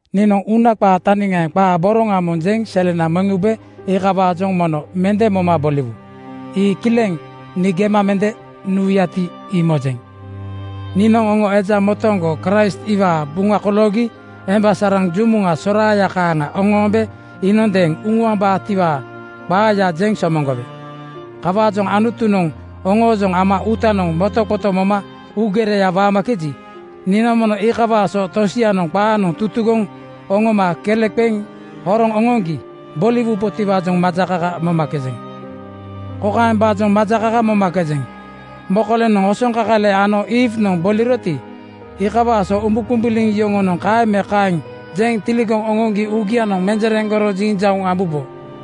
Niinoŋ uuna qaa taniŋaaŋ qaa boroŋa moŋ jeŋ selena meŋ ube iikawaajoŋ mono mende moma bimoowu. Ii kileŋ nii gema mende nuwuyati, ii mojeŋ. Niinoŋ oŋo eja motooŋgo Kraist iwaa buŋa koloogi emba saraŋ jumuŋa soraaya kaaŋa oŋoombe iinondeeŋ uŋuambaatiwaa qaaya jeŋ somoŋgowe. Kawaajoŋ Anutunoŋ oŋoojoŋ ama uutanoŋ motoqoto moma uugereya waamakeji, niinoŋ mono iikawaa so tosianoŋ qaanoŋ tutugoŋ oŋoma kele qeŋ horoŋ oŋoŋgi boliwubotiwaajoŋ majakaka momakejeŋ. Kokaembaajoŋ majakaka momakejeŋ: Mokolenoŋ osoŋkakale ano Iiwnoŋ (Eewanoŋ) boliroti, iikawaa so umbuqumbuliŋ yoŋonoŋ kaeŋ me kaeŋ jeŋ tiligoŋ oŋooŋgi uugianoŋ menjereŋgoro jinjauŋ ambubo.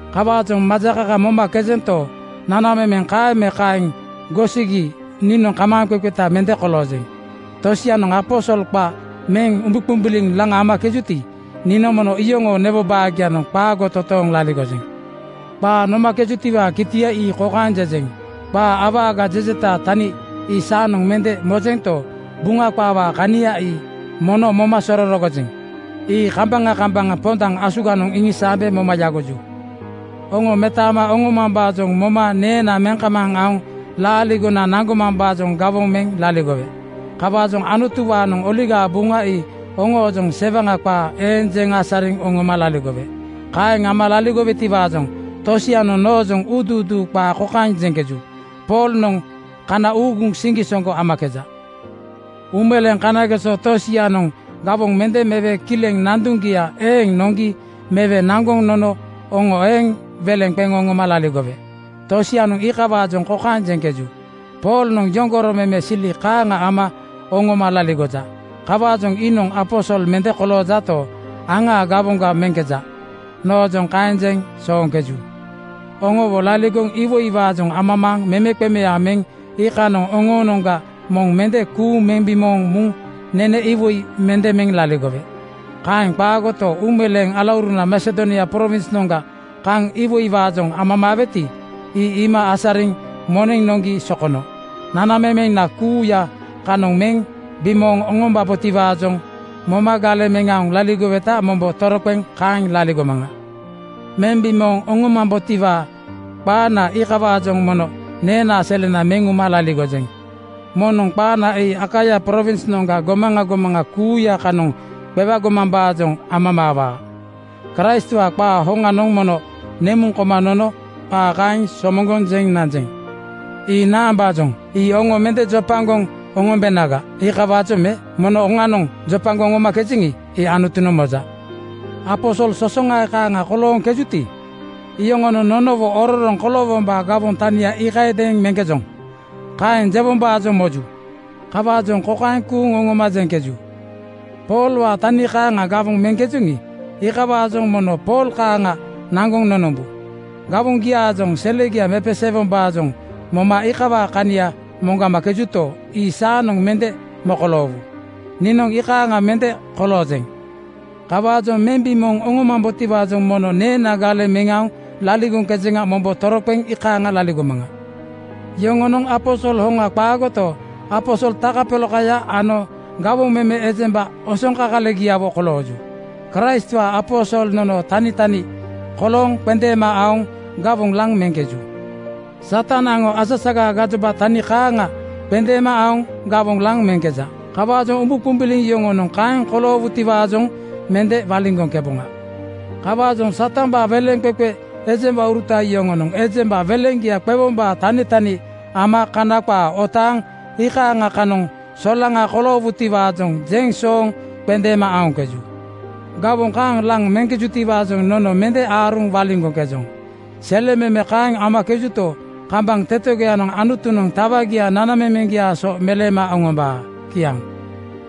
Kawaajoŋ majakaka momakejento, nanamemena kaeŋ me kaeŋ gosigi niinoŋ kamaaŋqeqeta mende koloojeŋ. Tosianoŋ aposol qa meŋ umbuqumbuliŋ laŋ amakejuti, niinoŋ mono iyoŋoo newo baagianoŋ qaago totooŋ laligojeŋ. Qaa nomakejutiwaa kitia ii kokaeŋ jejeŋ: Qaa awaga jejetaa tania ii saanoŋ mende mojento, Buŋa qaawaa kania ii mono moma sororogojeŋ. Ii kambaŋa kambaŋa pondaŋ asuganoŋ iŋisaambe moma yagoju. Oŋo metaama oŋomambaajoŋ moma neena meŋ kamaaŋ aoŋ laaligona naŋgomambaajoŋ gawoŋ meŋ laligowe. Kawaajoŋ Anutuwaanoŋ Oligaa Buŋa ii oŋoojoŋ sewaŋa qaa eeŋ jeŋ asariŋ oŋoma laligowe. Kaeŋ ama laligowetiwaajoŋ tosianoŋ noojoŋ uuduuduu qaa kokaeŋ jeŋkeju, “Poolnoŋ kana uuguŋ siŋgisoŋgo amakeja.” Uumeleeŋ kanageso tosianoŋ gawoŋ mende mewe kileŋ nanduŋgia eeŋ noŋgi mewe naŋgoŋ nono oŋo eeŋ weleŋ qeŋ oŋoma laligowe. Tosianoŋ iikawaajoŋ kokaeŋ jeŋkeju, “Poolnoŋ yoŋgoro meme sili kaaŋa ama oŋoma laligoja. Kawaajoŋ iinoŋ aposol mende koloojato, aŋaa gawoŋga meŋkeja.” Noojoŋ kaeŋ jeŋ sooŋkeju. Oŋowo laligoŋ iwoiwaajoŋ amamaaŋ memeqemeaŋ meŋ iikanoŋ oŋoonoŋga moŋ mende kuuŋ meŋ bimooŋ muŋ nene iwoiya mende meŋ laligowe. Kaeŋ qaagoto, uumeleeŋ alauruna Masedonia prowinsnoŋga kaŋ iwoiwaajoŋ amamaaweti, ii iima asariŋ moneŋ noŋgi sokono. Nanamemena kuuya kanoŋ meŋ bimooŋ oŋomambotiwaajoŋ moma galeŋ meŋ aoŋ laligoweta mombo toroqeŋ kaeŋ laligomaŋa. Meŋ bimooŋ oŋomambotiwaa qaana iikawaajoŋ mono neenaa selena meŋ uma laligojeŋ. Moŋnoŋ qaana ii Akaia prowinsgiaa gomaŋa gomaŋa kuuya kanoŋ qewagomambaajoŋ amamaawaa. Kraistwaa qaa hoŋanoŋ mono nemuŋ koma nono qaa kaeŋ somoŋgoŋ jeŋ nanjeŋ. Ii naambaajoŋ? Ii oŋo mende jopagoŋ oŋombenaga, iikawaajoŋ me? Mono oŋanoŋ jopagoŋ oŋomakejeŋi, ii Anutunoŋ moja. Aposol sosoŋae kaaŋa kolooŋkejuti, iyoŋonoŋ nonowo “Ororoŋ koloowombaa gawoŋ tania iikayadeeŋ meŋkejoŋ,” kaeŋ jewombaajoŋ moju. Kawaajoŋ kokaeŋ kuuŋ oŋoma jeŋkeju, “Poolwaa tani kaaŋa gawoŋ meŋkejoŋi, iikawaajoŋ mono Pool kaaŋa naŋgoŋ nonombu.” Gawoŋgiaajoŋ selegia mepeseewombaajoŋ moma iikawaa kania moŋgamakejuto, ii saanoŋ mende mokoloowu. Niinoŋ ii kaaŋa mende koloojeŋ. Kawaajoŋ meŋ bimooŋ oŋomambotiwaajoŋ mono neena galeŋ meŋ aoŋ laligoŋkejeŋa mombo toroqeŋ iikaaŋa laligomaŋa. Yoŋonoŋ aposol hoŋa qaagoto, aposol takapolakaya ano gawoŋ meme ejemba osoŋkakalegiawo kolooju. Kraistwaa aposol nonoo tanitani kolooŋ qendeema aoŋ gawoŋ laŋ meŋkeju. Satan aŋo asasagaa gajoba tani kaaŋa qendeema aoŋ gawoŋ laŋ meŋkeja. Kawaajoŋ umbuqumbuliŋ yoŋonoŋ kaeŋ koloogitiwaajoŋ mende waliŋgoŋkeboŋa. Kawaajoŋ Satambaa weleŋqeqe ejembauruta yoŋonoŋ ejemba weleŋgia qewombaa tanitani ama Kana qaa otaaŋ iikaaŋa kanoŋ solaŋa koloowutiwaajoŋ jeŋ sooŋ qendeema aoŋkeju. Gawoŋ kaaŋ laŋ meŋkejutiwaajoŋ nono mende aaruŋ waliŋgoŋkejoŋ. Selememe kaeŋ amakejuto, kambaŋ tetegoyanoŋ Anutunoŋ tawagia nanamemeŋgiaa so meleema oŋombaa. Kiaŋ.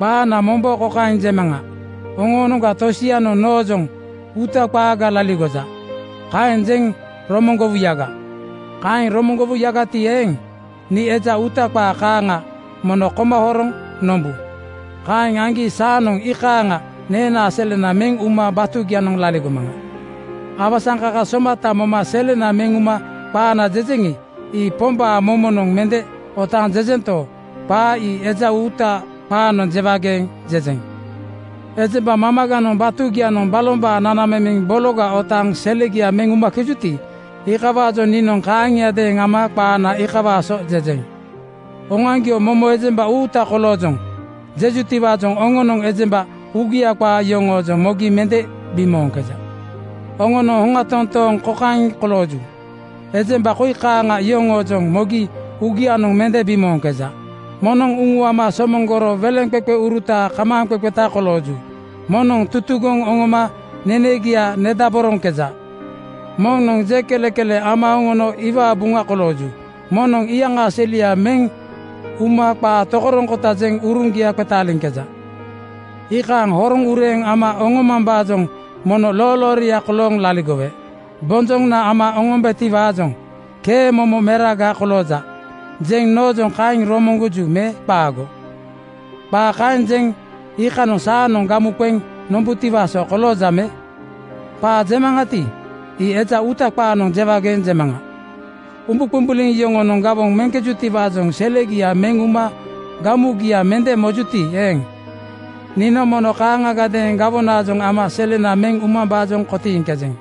Qaana mombo kokaeŋ jemaŋa: Oŋoonoŋga tosianoŋ noojoŋ “Uuta qaaga laligoja,” kaeŋ jeŋ romoŋgowuyaga. Kaeŋ romoŋgowuyagati eeŋ, nii eja uuta qaa kaaŋa mono koma horoŋ nombu. Kaeŋ aŋgi saanoŋ ii kaaŋa neenaa selena meŋ uma batugianoŋ laligomaŋa. Awasaŋkaka somata moma selena meŋ uma qaana jejeŋi, ii Pombaa momonoŋ mende otaaŋ jejento, qaa ii eja uuta qaanoŋ jewageeŋ jejeŋ. Ejemba mamaganoŋ batugianoŋ balombaa nanamemeŋ bologa otaaŋ selegia meŋ umakejuti, iikawaajoŋ niinoŋ kaaŋiadeeŋ ama qaana iikawaa so jejeŋ. Oŋoaŋgio “Momo ejemba uuta koloojoŋ,” jejutiwaajoŋ oŋonoŋ ejemba uugia qaa yoŋoojoŋ mogi mende bimooŋkeja. Oŋonoŋ hoŋa toontooŋ kokaeŋ kolooju: Ejemba koi kaaŋa yoŋoojoŋ mogi uugianoŋ mende bimooŋkeja: Moŋnoŋ uŋuama somoŋgoro weleŋqeqeuruta kamaaŋqeqeta kolooju. Moŋnoŋ tutugoŋ oŋoma nenegia nedaboroŋkeja. Moŋnoŋ jeŋ kelekele ama oŋono iwaa buŋa kolooju. Moŋnoŋ iyaŋaa selia meŋ uma qaa tokoroŋkota jeŋ uruŋgia qetaaliŋkeja. Ii kaaŋa horoŋ ureeŋ ama oŋomambaajoŋ mono loolooria kolooŋ laligowe. Bonjoŋa ama oŋombetiwaajoŋ “Kee momo meraga kolooja,” jeŋ noojoŋ kaeŋ romoŋgoju me qaago? Qaa kaeŋ jeŋ iikanoŋ saanoŋ gamu qeŋ nombutiwaa so kolooja me? Qaa jemaŋati, ii eja uuta qaanoŋ jewageeŋ jemaŋa. Umbuqumbuliŋ yoŋonoŋ gawoŋ meŋkejutiwaajoŋ selegia meŋ uma gamugia mende mojuti eeŋ, niinoŋ mono kaaŋagadeeŋ gawonaajoŋ ama selena meŋ umambaajoŋ kotiiŋkejeŋ.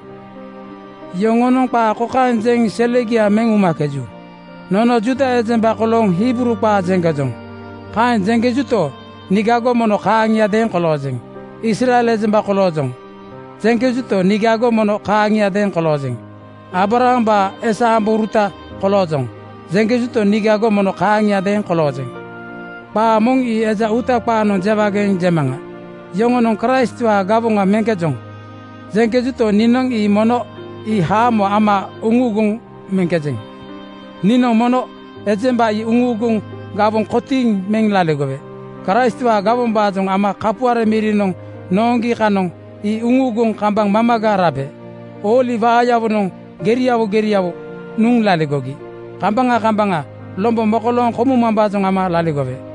Yoŋonoŋ qaa kokaeŋ jeŋ selegia meŋ umakeju, “Nono Juuda ejemba kolooŋ Hibruu qaa jeŋkejoŋ.” Kaeŋ jeŋkejuto, niigago mono kaaŋiadeeŋ koloojeŋ. “Israel ejemba koloojoŋ,” jeŋkejuto, niigago mono kaaŋiadeeŋ koloojeŋ. “Aabrahambaa esa ambouruta koloojoŋ,” jeŋkejuto, niigago mono kaaŋiadeeŋ koloojeŋ. Qaa moŋ ii eja uuta qaanoŋ jewageeŋ jemaŋa, “Yoŋonoŋ Kraistwaa gawoŋa meŋkejoŋ,” jeŋkejuto, niinoŋ ii mono ii haamo ama uŋuuguŋ meŋkejeŋ. Niinoŋ mono ejemba ii uŋuuguŋ gawoŋ kotiiŋ meŋ laligowe. Kraistwaa gawombaajoŋ ama kapuare mirinoŋ nooŋgi kanoŋ ii uŋuuguŋ kambaŋ mamaga rabe. Ooli waayawonoŋ geriawo geriawo nuŋ laligogi. Kambaŋa kambaŋa lombo mokolooŋ komumambaajoŋ ama laligowe.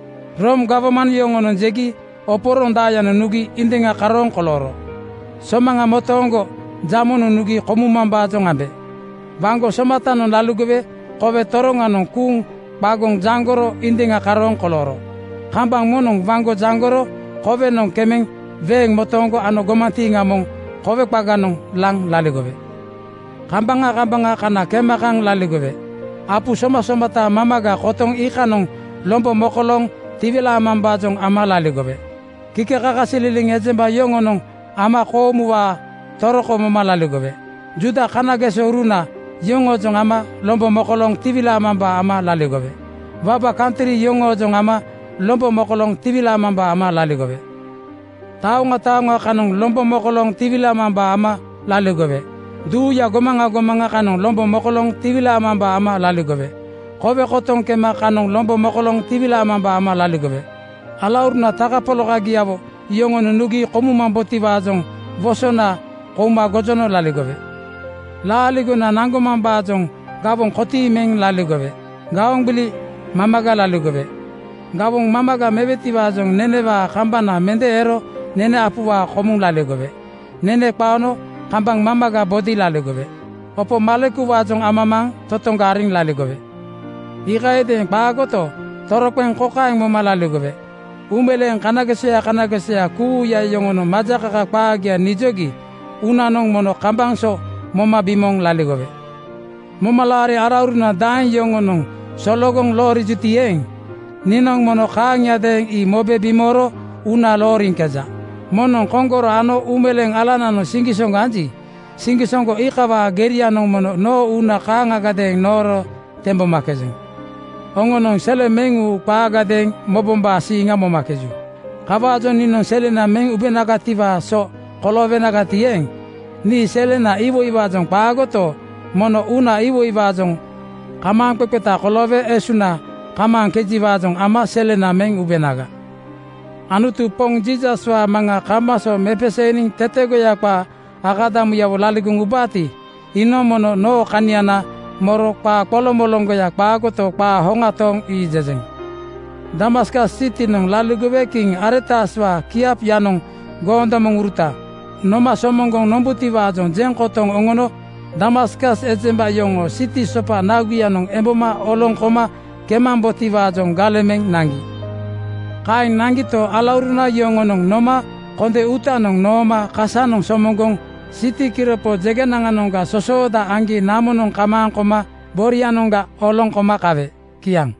Room gawman yoŋonoŋ jegi oporondaayanoŋ nugi indiŋa karooŋ kolooro. Somaŋa motooŋgo jamonoŋ nugi komumambaajoŋ ambe. Waŋgo somatanoŋ laligowe kowe toroŋanoŋ kuuŋ qagoŋ jaŋgoro indiŋa karooŋ kolooro. Kambaŋ moŋnoŋ waŋgo jaŋgoro kowenoŋ kemeŋ weeŋ motooŋgo ano gomantiiŋa moŋ kowe qaganoŋ laŋ laligowe. Kambaŋa kambaŋa kana kema kaŋ laligowe. Apu somasomata mamaga kotoŋ iikanoŋ lombo mokolooŋ tiwilaamambaajoŋ ama laligowe. Kikekakasililiŋ ejemba yoŋoojoŋ ama koomuwaa toroko moma laligowe. Juuda kanagesouruna yoŋoojoŋ ama lombo mokolooŋ tiwilaamambaa ama laligowe. Waba kantri yoŋoojoŋ ama lombo mokolooŋ tiwilaamambaa ama laligowe. Taoŋa taoŋa kanoŋ lombo mokolooŋ tiwilaamambaa ama laligowe. Duuyaa gomaŋa gomaŋa kanoŋ lombo mokolooŋ tiwilaamambaa ama laligowe. Kowe kotoŋ kema kanoŋ lombo mokolooŋ tiwilaamambaa ama laligowe. Alauruna takapolakagiawo yoŋonoŋ nugi komumambotiwaajoŋ wosona (ba kukuuna) kouma gojono laligowe. Laaligona naŋgomambaajoŋ gawoŋ kotiiŋ meŋ laligowe. Gaoŋ gbili mamaga laligowe. Gawoŋ mamaga mewetiwaajoŋ nenewaa kambana mende ero nene apuwaa komuŋ laligowe. Nene qaono kambaŋ mamaga bodi laligowe. Opo malekuwaajoŋ amamaaŋ totoŋga ariŋ laligowe. Iikayadeeŋ qaagoto, toroqeŋ kokaeŋ moma laligowe: Uumeleeŋ kanagesoya kanagesoya kuuya yoŋonoŋ majakaka qaagia nijogi uunanoŋ mono kambaŋ so moma bimooŋ laligowe. Momalaari alauruna daeŋ yoŋonoŋ sologoŋ loorijuti eeŋ, niinoŋ mono kaaŋiadeeŋ ii mobe bimooro uuna looriŋkeja. Moŋnoŋ koŋgoro ano uumeleeŋ alananoŋ siŋgisoŋgo anji, siŋgisoŋgo iikawaa gerianoŋ mono noo uuna kaaŋagadeeŋ nooro tembomakejeŋ. Oŋonoŋ sele meŋ-uu qaagadeeŋ mobombaa siiŋa momakeju. Kawaajoŋ niinoŋ selena meŋ ubenagatiwaa so koloowenagati eeŋ, nii selenaa iwoiwaajoŋ qaagoto, mono uunaa iwoiwaajoŋ kamaaŋqeqeta koloowe esuŋna kamaaŋkejiwaajoŋ ama selena meŋ ubenaga. Anutu Poŋ Jiisaswaa Maŋa kambaŋ so mepeseeniŋ tetegoya qaa akadamuyawo laligoŋ ubaati, iinoŋ mono noo kaniana moro qaa qoloŋmoloŋgoya qaagoto, qaa hoŋa tooŋ ii jejeŋ. Damaskas sitinoŋ laligowe kiŋ Aretaswaa kiapyanoŋ goondomoŋuruta noma somoŋgoŋ nombutiwaajoŋ jeŋ kotoŋ oŋono Damaskas ejemba yoŋoo siti sopa naguyanoŋ emboma oloŋ koma kemambotiwaajoŋ galeŋ meŋ naŋgi. Kaeŋ naŋgito, alauruna yoŋonoŋ noma konde uutanoŋ nooma kasanoŋ somoŋgoŋ siti kiropo jeŋgenanoŋga sosooda aŋgi namonoŋ kamaaŋ koma borianoŋga oloŋ koma kawe. Kiaŋ.